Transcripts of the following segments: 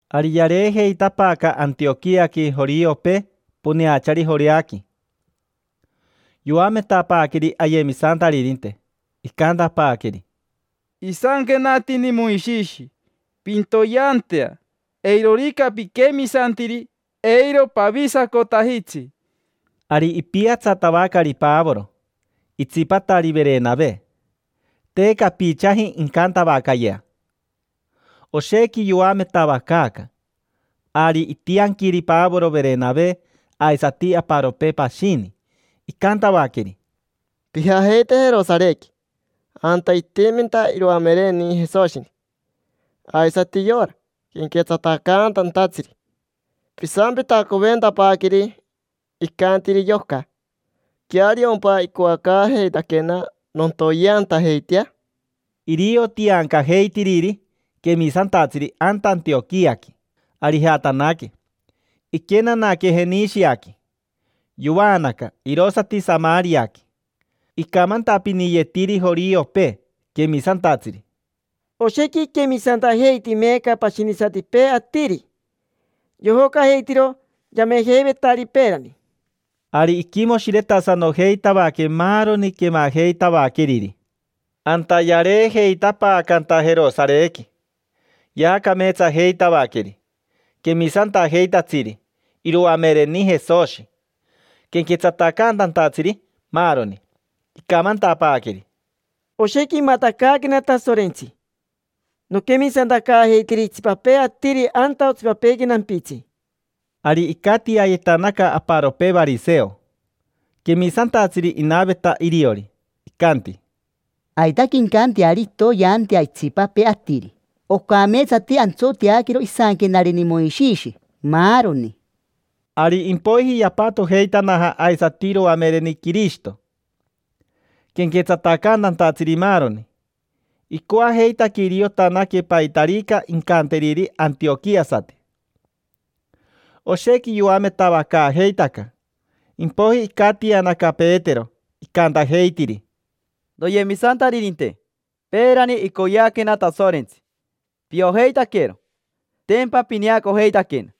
Ari yareejeitapaaca Antioquiaqui joriopee poneachari Joreaqui. Yoametapaaqueri ayemisantaririnte, icantapaaqueri: —Isanquenatini Moishishi: “Pintoyeantea”. Eirorica piquemisantiri, eiro pavisacotajitsi. Ari ipiatsatavacari Pavoro, itsipatari Verenave. Te capichaji incantavacayea: oshequi yoametavacaaca. Ari itianquiri Pavoro, Verenave, aisati aparopee pashini. Icantavaqueri: —Pijajeite Jerosarequi anta itiminta iroamereni Jesoshi, aisati yora quenquetsatacaantatsiri. Pisampitacoventapaaqueri icantiri yoca. ¿Queariompa icoacaajeitaquena nontoyeantajeitea? Irio tiancajeitiriri quemisantatsiri anta Antioquiaqui. Ari ijatanaque, iquenanaque Jenishiaqui. Yovaanaca, irosati Samariaqui. Icamantapiniyetiri joriopee quemisantatsiri: —Oshequi iquemisantajeiti meeca pashinisatipee atiri, yojocajeitiro yamejeivetari peerani. Ari iquimoshiretasanojeitavaque maaroni quemajeitavaqueriri. Anta yareejeitapaacanta Jerosarequi, yaacameetsajeitavaqueri quemisantajeitatsiri: iroamereni Jesoshi, quenquetsatacaantatsiri, maaroni. Icamantapaaqueri: —Oshequi imatacaaquena Tasorentsi noquemisantacaajeitiri itsipapee atiri anta otsipapeequi nampitsi. Ari icatiayetanaca aparopee variseo, quemisantatsiri inaveta iriori. Icanti: —Aitaque incanteari intoyeantea itsipapee atiri. Ocameetsati antsoteaquero isanquenareni Moishishi, maaroni. Ari impoiji yapatojeitanaja aisati iroamereni Quirishito, quenquetsatacaantatsiri, maaroni. Icoajeitaque iriotanaque paitarica incanteriri antioquiasati. Oshequi yoametavacaajeitaca. Impoiji icatianaca Petero, icantajeitiri: —Noyemisantaririnte. Peerani icoyeaquena Tasorentsi, piojeitaquero: tempa pineacojeitaquena.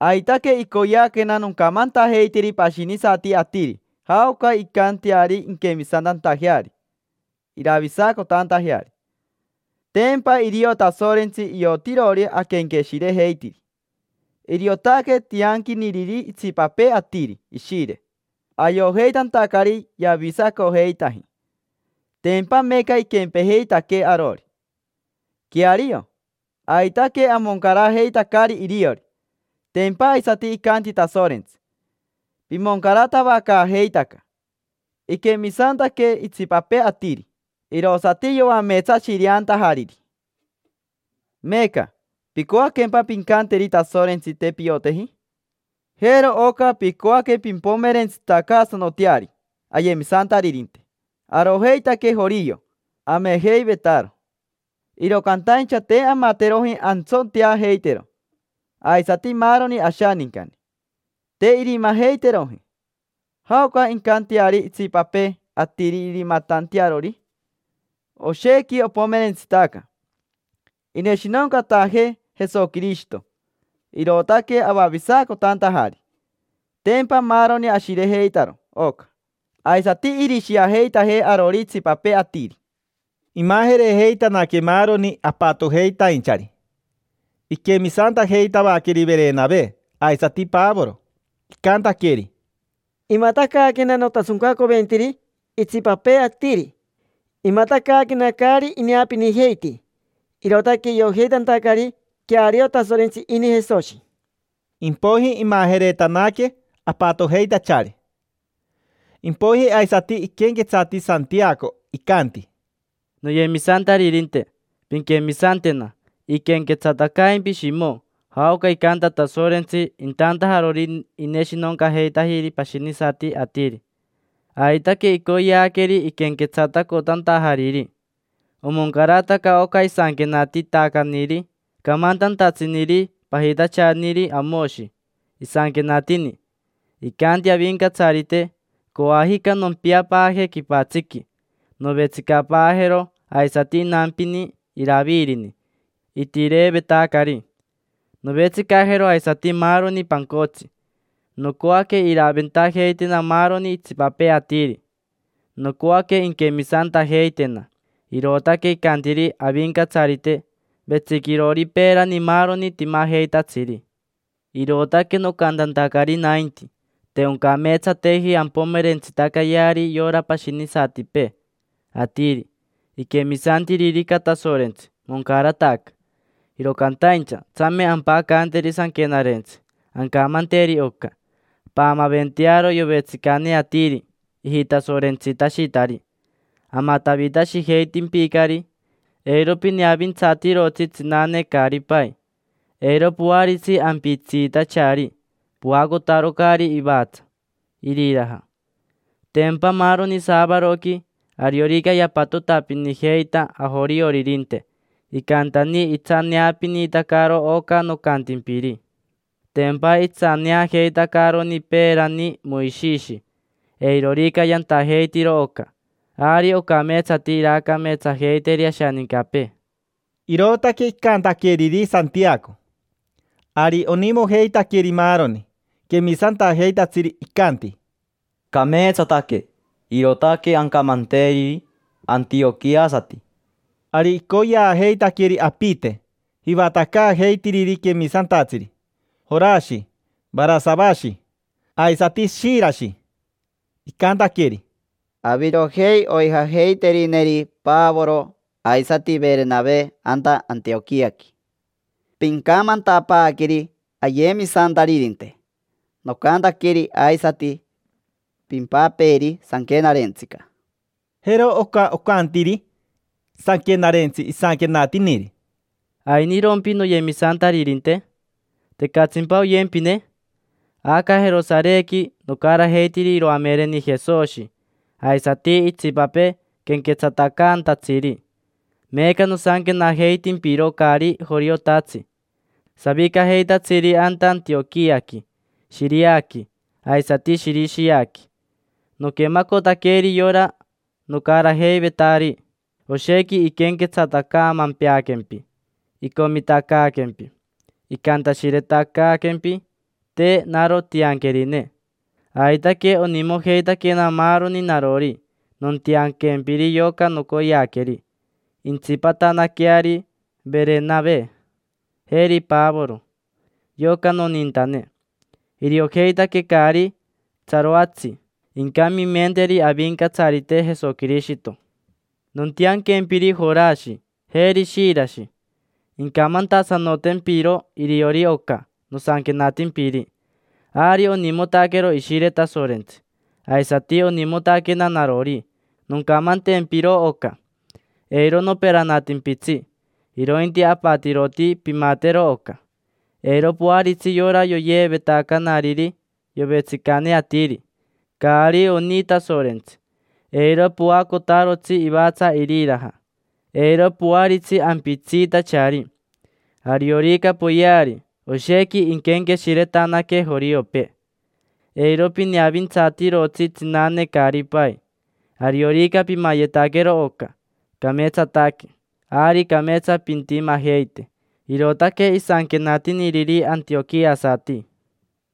Aitaque icoyeaquena noncamantajeiteri pashinisati atiri jaoca incanteari inquemisantantajeari, iravisacotantajeari. Tempa irio Tasorentsi iotirori aquenqueshirejeitiri. Iriotaque tianquiniriri itsipapee atiri Ishire, ayojeitantacari yavisacojeitaji. Tempa meeca iquempejeitaquee arori. Queario, aitaque amoncarajeitacari iriori. Tempa aisati icanti Tasorentsi: “Pimoncaratavacaajeitaca”. Iquemisantaque itsipapee atiri, irosati yoameetsashireantajariri. Meeca, ¿picoaquempa pincanteri Tasorentsi: “Te pioteji”? Jero oca picoaque pimpomerentsitacaasanoteari ayemisantaririnte. Arojeitaque jorio, amejeivetaro, iro cantaincha te amateroji antsoteajeitero, aisati maaroni ashanincani, te irimajeiteroji. ¿Jaoca incanteari itsipapee atiri irimatantearori? Oshequi opomerentsitaca. Ineshinoncatajee Jesoquirishito, irootaque avavisacotantajari. Tempa maaroni ashirejeitaro oca. Aisati irishiajeitajee arori itsipapee atiri. Imajerejeitanaque maaroni apatojeitainchari. Iquemisantajeitavaqueri Verenave, aisati Pavoro. Icantaqueri: —Imatacaaquena notasoncacoventiri itsipapee atiri. Imatacaaquena caari ineapinijeiti, irootaque iojeitantacari queario Tasorentsi ini Jesoshi. Impoiji imajeretanaque apatojeitachari. Impoiji aisati iquenquetsati Santiaco, icanti: —Noyemisantaririnte, pinquemisantena. Iquenquetsatacaimpi Shimo jaoca icanta Tasorentsi intantajarori ineshinoncajeitajiri pashinisati atiri. Aitaque icoyeaqueri iquenquetsatacotantajariri. Omoncarataca oca isanquenatitacaniri camantantatsiniri pajitachaniri Amoshi. Isanquenatini: “Icanti Avincatsarite: ‘Coajica nompiapaaje quipatsiqui, novetsicapaajero aisati inampini Iravirini itireevetacari. Novetsicajero aisati maaroni pancotsi. Nocoaque iraventajeitena maaroni itsipapee atiri, nocoaque inquemisantajeitena’. Irootaque icantiri Avincatsarite, vetsiquirori peerani maaroni timajeitatsiri”. Irootaque nocantantacari nainti te oncameetsateji ampomerentsitacayeari yora pashinisatipee atiri. Iquemisantiririca Tasorentsi, moncarataca. Iro cantaincha, tsame ampacanteri sanquenarentsi. Ancamanteri oca: “Paamaventearo yovetsicane atiri ijitasorentsitashitari: amatavitashijeitimpicari. Eiro pineavintsatirotsi tsinane caari pai. Eiro poaritsi ampitsiitachari, poacotarocari ivatsa iriraja”. Tempa maaroni saavaroqui, ariorica yapatotapinijeita ajorioririnte, icantani itsaneapinitacaro oca nocantimpiri: tempa itsaneajeitacaroni peerani Moishishi. Eirorica yantajeitiro oca, ari ocameetsati iraacameetsajeiteri ashanincapee. Irootaque icantaqueriri Santiaco. Ari onimojeitaqueri maaroni quemisantajeitatsiri, icanti: —Cameetsataque. Irootaque ancamanteriri antioquiasati. Ari icoyeajeitaqueri apite jivatacaajeitiriri quemisantatsiri: Jorashi Varasavashi, aisati Shirashi. Icantaqueri: —Avirojei oijajeiterineri Pavoro aisati Verenave anta Antioquiaqui. Pincamantapaaqueri ayemisantaririnte nocantaqueri aisati pimpapeeri sanquenarentsica. Jero oca ocantiri sanquenarentsi isanquenatiniri: “¿Ainirompi noyemisantaririnte? ¿Tecatsimpa oyempine? Aca Jerosarequi nocarajeitiri iroamereni Jesoshi aisati itsipapee quenquetsatacaantatsiri. Meeca nosanquenajeitimpiro caari joriotatsi, savicajeitatsiri anta Antioquiaqui, Shiriaqui, aisati Shirishiaqui. Noquemacotaqueri yora nocarajeivetari: oshequi iquenquetsatacaamempeaquempi, icomitacaaquempi. Icantashiretacaaquempi. Te naro tianquerine. Aitaque onimojeitaquena maaroni narori nontianquempiri yoca nocoyeaqueri. Intsipatanaqueari Verenave, jeri Pavoro: yoca nonintane. Iriojeitaque caari tsaroatsi incamimenteri Avincatsarite Jesoquirishito. Nontianquempiri Jorashi, jeri Shirashi. Incamantasanotempiro iriori oca nosanquenatimpiri. Ari onimotaquero Ishire Tasorentsi, aisati onimotaquena narori noncamantempiro oca. Eiro noperanatimpitsi, irointi apatiroti pimatero oca. Eiro poaritsi yora yoyeevetacanariri yovetsicane atiri: caari oni Tasorentsi. Eiro poacotarotsi ivatsa iriraja. Eiro poaritsi ampitsiitachari. Ariorica poyeari, oshequi inquenqueshiretanaque joriopee. Eiro pineavintsatirotsi tsinane caari pai. Ariorica pimayetaquero oca, cameetsataque. Ari cameetsa pintimajeite”. Irootaque isanquenatiniriri antioquiasati.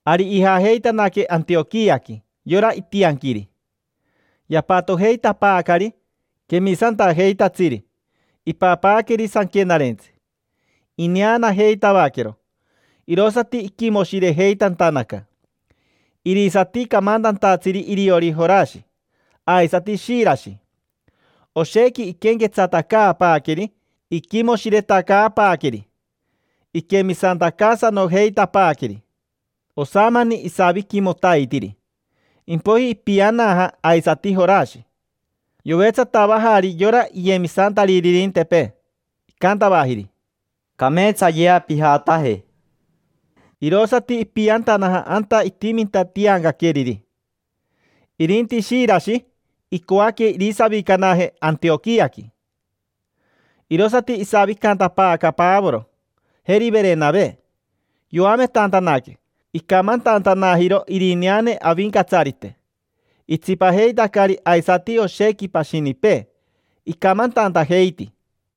Ari ijajeitanaque Antioquiaqui yora itianquiri. Yapatojeitapaacari quemisantajeitatsiri, ipapaaqueri sanquenarentsi. Ineanajeitavaquero, irosati iquimoshirejeitantanaca. Irisati camantantatsiri iriori Jorashi, aisati Shirashi. Oshequi iquenquetsatacaapaaqueri iquimoshiretacaapaaqueri, iquemisantacaasanojeitapaaqueri. Osamani isaviquimotaitiri, impoiji ipianaja aisati Jorashi. Yovetsatavajari yora iyemisantaririntepee, icantavajiri: —Cameetsayea pijataje. Irosati ipiantanaja anta itiminta tiancaqueriri. Irinti Shirashi icoaque irisavicanaje Antioquiaqui. Irosati isavicantapaaca Pavoro, jeri Verenave. Yoametantanaque, icamantantanajiro irineane Avincatsarite. Itsipajeitacari aisati oshequi pashinipee, icamantantajeiti.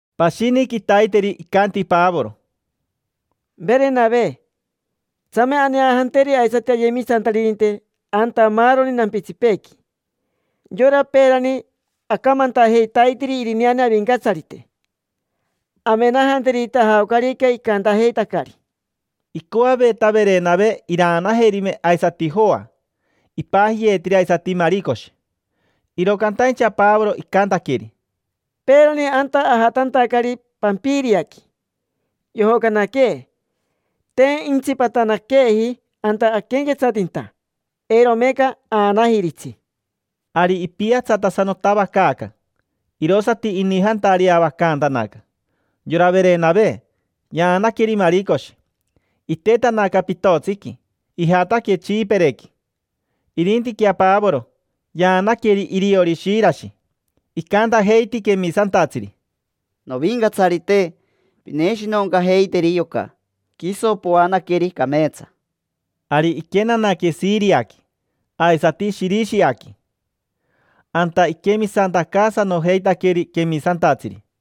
Pashini quitaiteri icanti Pavoro: —Verenave. Tsame aneajanteri aisati ayemisantaririnte anta maaroni nampitsipeequi: yora peerani acamantajeitaitiri irineane Avincatsarite. Amenajanterita jaocarica icantajeitacari. Icoaveta Verenave iraanajerime aisati Joa. Ipajiyeetiri aisati Maricoshi. Iro cantaincha Pavoro, icantaqueri: —Peerani anta ajatantacari Pampiriaqui, yojocanaquee. Te intsipatanaqueeji anta aquenquetsatinta. Eiro meeca aanajiritsi. Ari ipiatsatasanotavacaaca, irosati inijantareavacantanaca. Yora Verenave, yaanaqueri Maricoshi. Itetanaca pitotsiqui, ijataque Tsipirequi. Irintiquea Pavoro, yaanaqueri iriori Shirashi. Icantajeiti quemisantatsiri: —Novincatsarite, pineshinoncajeiteri yoca, quiso poanaqueri cameetsa. Ari iquenanaque Shiriaqui, aisati Shirishiaqui. Anta iquemisantacaasanojeitaqueri quemisantatsiri.